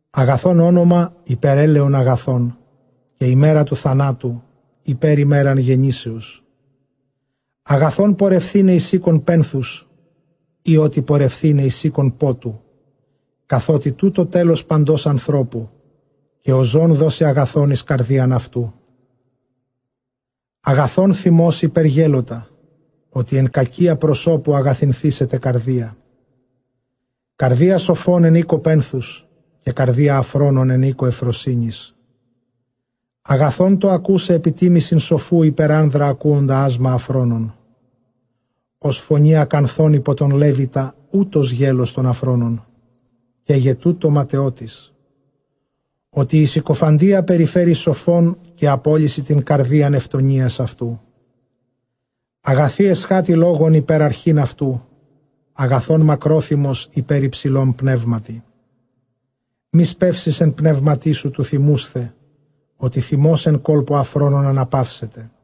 Ἀγαθὸν ὄνομα ὑπὲρ ἔλαιον ἀγαθὸν, καὶ ἡμέρα τοῦ θανάτου ὑπὲρ ἡμέραν γεννήσεως. Ἀγαθὸν πορευθῆναι εἰς οἶκον πένθους ἢ ὅτι πορευθῆναι εἰς οἶκον πότου· καθότι τοῦτο τέλος παντὸς ἀνθρώπου, καὶ ὁ ζῶν δώσει ἀγαθὸν εἰς καρδίαν αὐτοῦ. Ἀγαθὸν θυμὸς ὑπὲρ γέλωτα, ὅτι ἐν κακίᾳ προσώπου ἀγαθυνθήσεται καρδία. Καρδία σοφῶν ἐν οἴκῳ πένθους, καὶ καρδία ἀφρόνων ἐν οἴκῳ εὐφροσύνης. Ἀγαθὸν τὸ ἀκοῦσαι ἐπιτίμησιν σοφοῦ ὑπὲρ ἄνδρα ἁκούοντα ᾆσμα ἀφρόνων. Ὡς φωνὴ ἀκανθῶν ὑπὸ τὸν λέβητα, οὕτως γέλως τῶν ἀφρόνων· καί γε τοῦτο ματαιότης. Ὅτι ἡ συκοφαντία περιφέρει σοφὸν, καὶ ἀπόλλυσι τὴν καρδίαν εὐγενείας αὐτοῦ. Ἀγαθὴ ἐσχάτη λόγων ὑπὲρ ἀρχὴν αὐτοῦ, ἀγαθὸν μακρόθυμος ὑπὲρ ὑψηλὸν πνεύματι. Μὴ σπεύσῃς ἐν πνεύματί σου τοῦ θυμοῦσθαι, ὅτι θυμὸς ἐν κόλπῳ ἀφρόνων ἀναπαύσεται.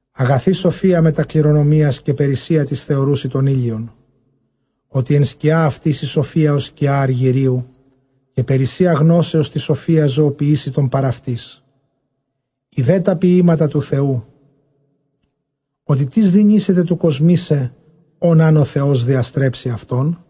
Ἀγαθὴ σοφία μετὰ κληρονομίας, καὶ περίσσεια τοῖς θεωροῦσι τὸν ἥλιον. Ὅτι ἐν σκιᾷ αὐτῆς ἡ σοφία ὡς σκιὰ ἀργυρίου, καὶ περίσσεια γνώσεως τῆς σοφίας ζωοποιήσει τὸν παρʼ αὐτῆς. Ἴδε τὰ ποιήματα τοῦ Θεοῦ, ὅτι τίς δυνήσεται κοσμῆσαι ὃν ἂν ὁ Θεὸς διαστρέψῃ αὐτόν;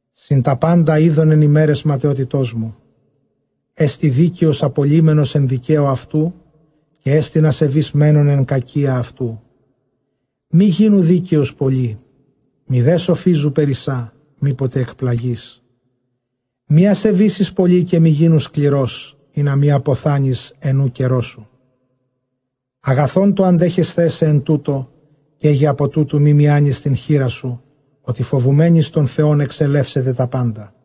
Σύμπαντα εἶδον ἐν ἡμέραις ματαιότητός μου· ἐστὶ δίκαιος ἀπολλύμενος ἐν δικαίῳ αὐτοῦ, καί ἐστιν ἀσεβὴς μένων ἐν κακίᾳ αὐτοῦ. Μὴ γίνου δίκαιος πολὺ, μηδὲ σοφίζου περισσὰ, μή ποτε ἐκπλαγῇς. Μὴ ἀσεβήσῃς πολὺ, καὶ μὴ γίνου σκληρὸς, ἵνα μὴ ἀποθάνῃς ἐν οὐ καιρῷ σου. Ἀγαθὸν τὸ ἀντέχεσθαί σε ἐν τούτῳ, καί γε ἀπὸ τούτου μὴ μιάνῃς τὴν χεῖρά σου, ὅτι φοβουμένοις τὸν Θεὸν ἐξελεύσεται τὰ πάντα.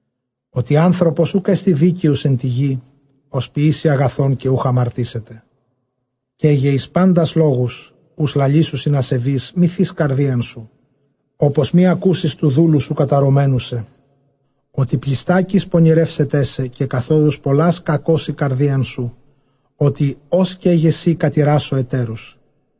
Ὅτι ἄνθρωπος οὐκ ἔστι δίκαιος ἐν τῇ γῇ, ὃς ποιήσει ἀγαθὸν καὶ οὐχ ἁμαρτήσεται. Καί γε εἰς πάντας λόγους οὓς λαλήσουσιν ἀσεβεῖς, μὴ θῇς καρδίαν σου, ὅπως μὴ ἀκούσῃς τοῦ δούλου σου καταρωμένου σε. Ὅτι πλειστάκις πονηρεύσεταί σε, καὶ καθόδους πολλὰς κακώσει καρδίαν σου, ὅτι ὡς καί γε σὺ κατηράσω ἑτέρους.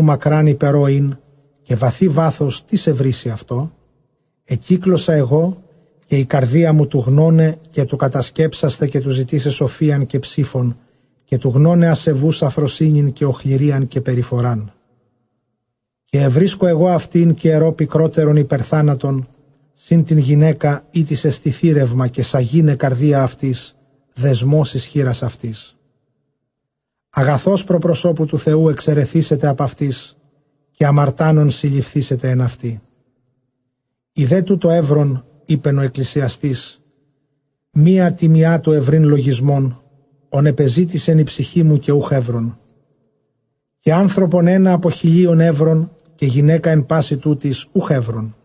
Μακρὰν ὑπὲρ ὃ ἦν, καὶ βαθὺ βάθος, τίς εὑρήσει αὐτό; Ἐκύκλωσα ἐγὼ καὶ ἡ καρδία μου τοῦ γνῶναι καὶ τοῦ κατασκέψασθαι καὶ τοῦ ζητῆσαι σοφίαν καὶ ψῆφον, καὶ τοῦ γνῶναι ἀσεβοῦς ἀφροσύνην καὶ ὀχληρίαν καὶ περιφοράν. Καὶ εὑρίσκω ἐγὼ αὐτὴν, καὶ ἐρῶ πικρότερον ὑπὲρ θάνατον· σὺν τὴν γυναῖκα ἥτις ἐστι θήρευμα, καὶ σαγῆναι καρδία αὐτῆς, δεσμὸς εἰς χεῖρας αὐτῆς· ἀγαθὸς πρὸ προσώπου τοῦ Θεοῦ ἐξαιρεθήσεται ἀπʼ αὐτῆς, καὶ ἁμαρτάνων συλληφθήσεται ἐν αὐτῇ. Ἴδε τοῦτο εὗρον, εἶπεν ὁ Ἐκκλησιαστής· μία τῇ μιᾷ τοῦ εὑρεῖν λογισμὸν, ὃν ἐπεζήτησεν ἡ ψυχή μου, καὶ οὐχ εὗρον· καὶ ἄνθρωπον ἕνα ἀπὸ χιλίων εὗρον, καὶ γυναῖκα ἐν πᾶσι τούτοις οὐχ εὗρον.